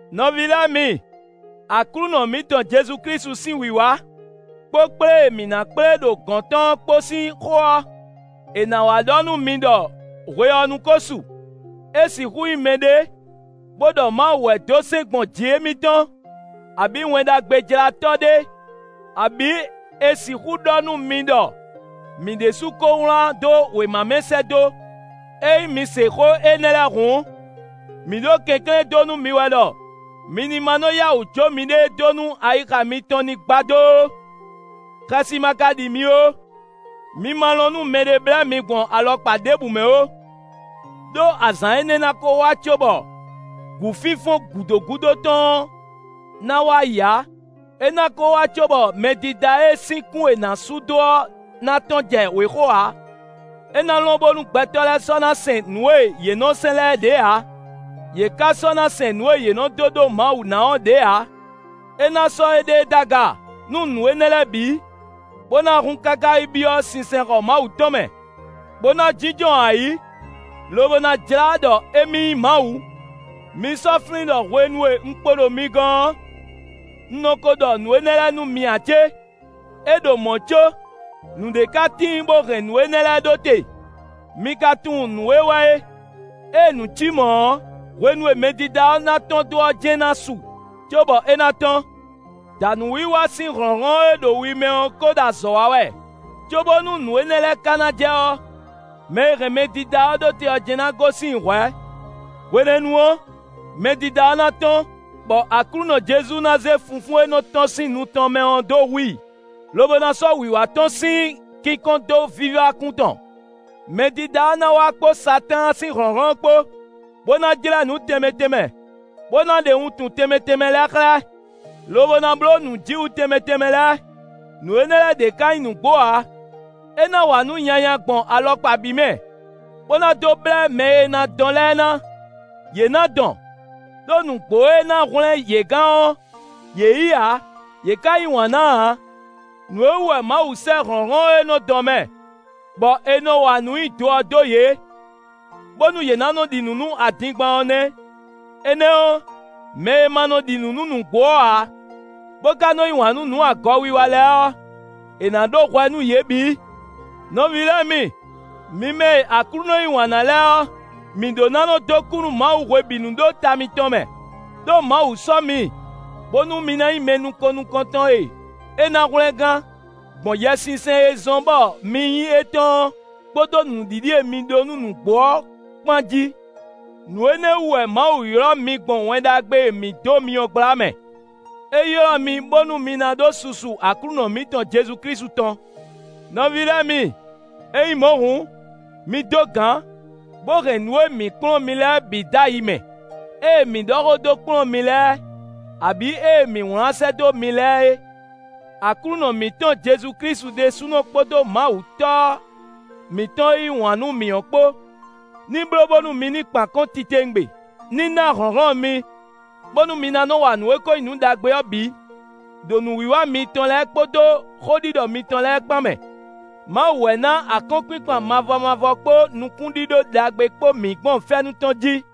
Nɔví lɛ́ɛ mi, Aklúnɔ mǐtɔn Jezu Klísu sín wǐwá, kpó kplé e mǐ ná kplé ɖo gɔ̌n tɔn ɔ́ kpó sín xó ɔ́, è nǎ wá ɖɔ nú mi ɖɔ hwe ɔ́ nu ko su; é sixú nyí mɛɖé, bó ɖɔ Mawu wɛ dó sɛ́n gbɔn jǐ émítɔn, abǐ Wɛn Ɖagbejlátɔ́ ɖé, abǐ è sixú ɖɔ nú mi ɖɔ mǐ ɖésú ko wlán dó wěma mɛ sɛ́ dó. Ényí mi se xó énɛ́ lɛ́ɛ hǔn, mǐ ɖo kɛnklɛ́n dó nú mi wɛ ɖɔ mi ní ma nɔ yá wǔ jó miɖée dó nú ayixa mitɔn ní gbadó ó; xɛsi ma ka ɖi mi ó. Mi ma lɔn nú mɛɖé blɛ́ mi gbɔn alɔkpa ɖěbǔ mɛ ó, ɖó azǎn énɛ́ ná ko wá cóbɔ gǔfínfɔ́n gǔdo gúdo tɔn ɔ́ na wá yi ǎ; é ná ko wá cóbɔ Mɛdídá e sín kún è nǎ sú dó ɔ́ ná tɔ́n jɛ wěxo ǎ. É ná lɔn bónú gbɛtɔ́ lɛ́ɛ sɔ́ ná sɛn nǔ e yě nɔ sɛn lɛ́ɛ ɖě ǎ; yě ká sɔ́ ná sɛn nǔ e yě nɔ dó ɖó Mawu ná ɔ́ ɖě ǎ. É ná sɔ́ éɖée ɖó aga, nú nǔ énɛ́ lɛ́ɛ bǐ, bó ná hun káká yi byɔ́ sinsɛnxɔ Mawu tɔn mɛ, bó na jínjɔ́n ayǐ, lobo ná jlá ɖɔ émí nyí Mawu. Mi sɔ́ flín ɖɔ hwenu e un kpo ɖo mi gɔ́n ɔ́, un nɔ ko ɖɔ nǔ énɛ́ lɛ́ɛ nú mi ǎ cé? É ɖo mɔ̌ có, nǔɖé ka tíin bó hɛn nǔ énɛ́ lɛ́ɛ ɖó te; mi ka tunwun nǔ e wɛ é. Ée nǔ cí mɔ̌ ɔ́, hwenu e Mɛdídá ɔ́ ná tɔ́n dó ɔ́ jɛ́n ná su cóbɔ é ná tɔ́n. Dǎnúwiwa sín hlɔ̌nhlɔ́n e ɖo wi mɛ ɔ́ ko ɖo azɔ̌ wa wɛ. Cóbónú nǔ énɛ́ lɛ́ɛ ka ná jɛ ɔ́, mɛ e hɛn Mɛdídá ɔ́ ɖó te ɔ́ jɛ́n ná gosín i hwɛ̌. Hwenɛ́nu ɔ́, Mɛdídá ɔ́ ná tɔ́n, bɔ Aklúnɔ Jezu ná zé funfún e nɔ́ tɔ́n sín nu tɔn mɛ ɔ́ dó hu i, lobo ná sɔ́ wǐwá tɔn sín kínkɔ́n dó vívá kún tɔn. Mɛdídá ɔ́ ná wá kpó Satáan sín hlɔ̌nhlɔ́n kpó, bó ná jlɛ́ nǔ tɛnmɛ tɛnmɛ, bó ná ɖe wuntun tɛnmɛ tɛnmɛ lɛ́ɛ xlɛ́, lobo ná bló nǔjíwǔ tɛnmɛ tɛnmɛ lɛ́ɛ; nǔ énɛ́ lɛ́ɛ ɖě ká nyí nǔgbó ǎ. É ná wa nǔ nyanya gbɔn alɔkpa bǐ mɛ, bó ná dó blɛ́ mɛ e ná dɔn lɛ́ɛ ná; yě ná dɔn, ɖó nǔgbó e ná hwlɛ́n yě gán ɔ́, yě yí ǎ; yě ká yí wǎn ná ǎ. Nǔ e wú wɛ Mawu sɛ́ hlɔ̌nhlɔ́n e nɔ dɔn mɛ, bɔ è nɔ wa nǔ nyi do ɔ́ dó yě, bónú yě ná nɔ ɖi nǔ nú adingban ɔ́ nɛ́. Énɛ́ ɔ́, mɛ e ma ɖi nǔ nú nǔgbó ɔ́ ǎ, bó ka nɔ yí wǎn nú nǔ agɔ wiwa lɛ́ɛ ɔ́, è nǎ ɖó hwɛ nú yě bǐ. Nɔví lɛ́ɛ mi, mi mɛ e Aklúnɔ yí wǎn ná lɛ́ɛ ɔ́, mǐ ɖó ná nɔ dó kú nú Mawu hwebǐnu ɖó ta mitɔn mɛ. Đó Mawu sɔ́ mi, bónú mi ná nyí mɛ nukɔn nukɔntɔn e é ná hwlɛngán, gbɔn Yɛsinsɛn e zɔ́n bɔ mi nyí étɔn ɔ́ kpódó nǔɖiɖi e mi ɖó nú nǔgbó ɔ́ kpán jí. Nǔ énɛ́ wú wɛ Mawu ylɔ́ mi gbɔn Wɛn Ɖagbe e mǐ dó mi ɔ́ gbla mɛ; é ylɔ́ mi bónú mi ná ɖó susu Aklúnɔ mǐtɔn Jezu Klísu tɔn. Nɔví lɛ́ɛ mi, ényí mɔ̌ hǔn, mi dó gǎn, bó hɛn nǔ e mǐ kplɔ́n mi lɛ́ɛ bǐ dó ayi mɛ: ée mǐ ɖɔ xó dó kplɔ́n mi lɛ́ɛ, abǐ ée mǐ wlán sɛ́ dó mi lɛ́ɛ é. Aklúnɔ mǐtɔn Jezu Klísu ɖésúnɔ kpódó Mawu Tɔ́ mǐtɔn e yí wǎn nú mǐ ɔ́ kpó, ní bló bónú mi ní kpan akɔ́n titewungbe; ní ná hlɔ̌nhlɔ́n mi, bónú mi ná nɔ́ wa nǔ e ko nyí nǔ ɖagbe ɔ́ bǐ, ɖo nǔwiwa mitɔn lɛ́ɛ kpódó xóɖiɖɔ mitɔn lɛ́ɛ kpán mɛ. Mawu wɛ na akɔ́nkpinkpan mavɔ mavɔ kpó nukúnɖíɖó ɖagbe kpó mǐ gbɔn fɛ́nú tɔn jí.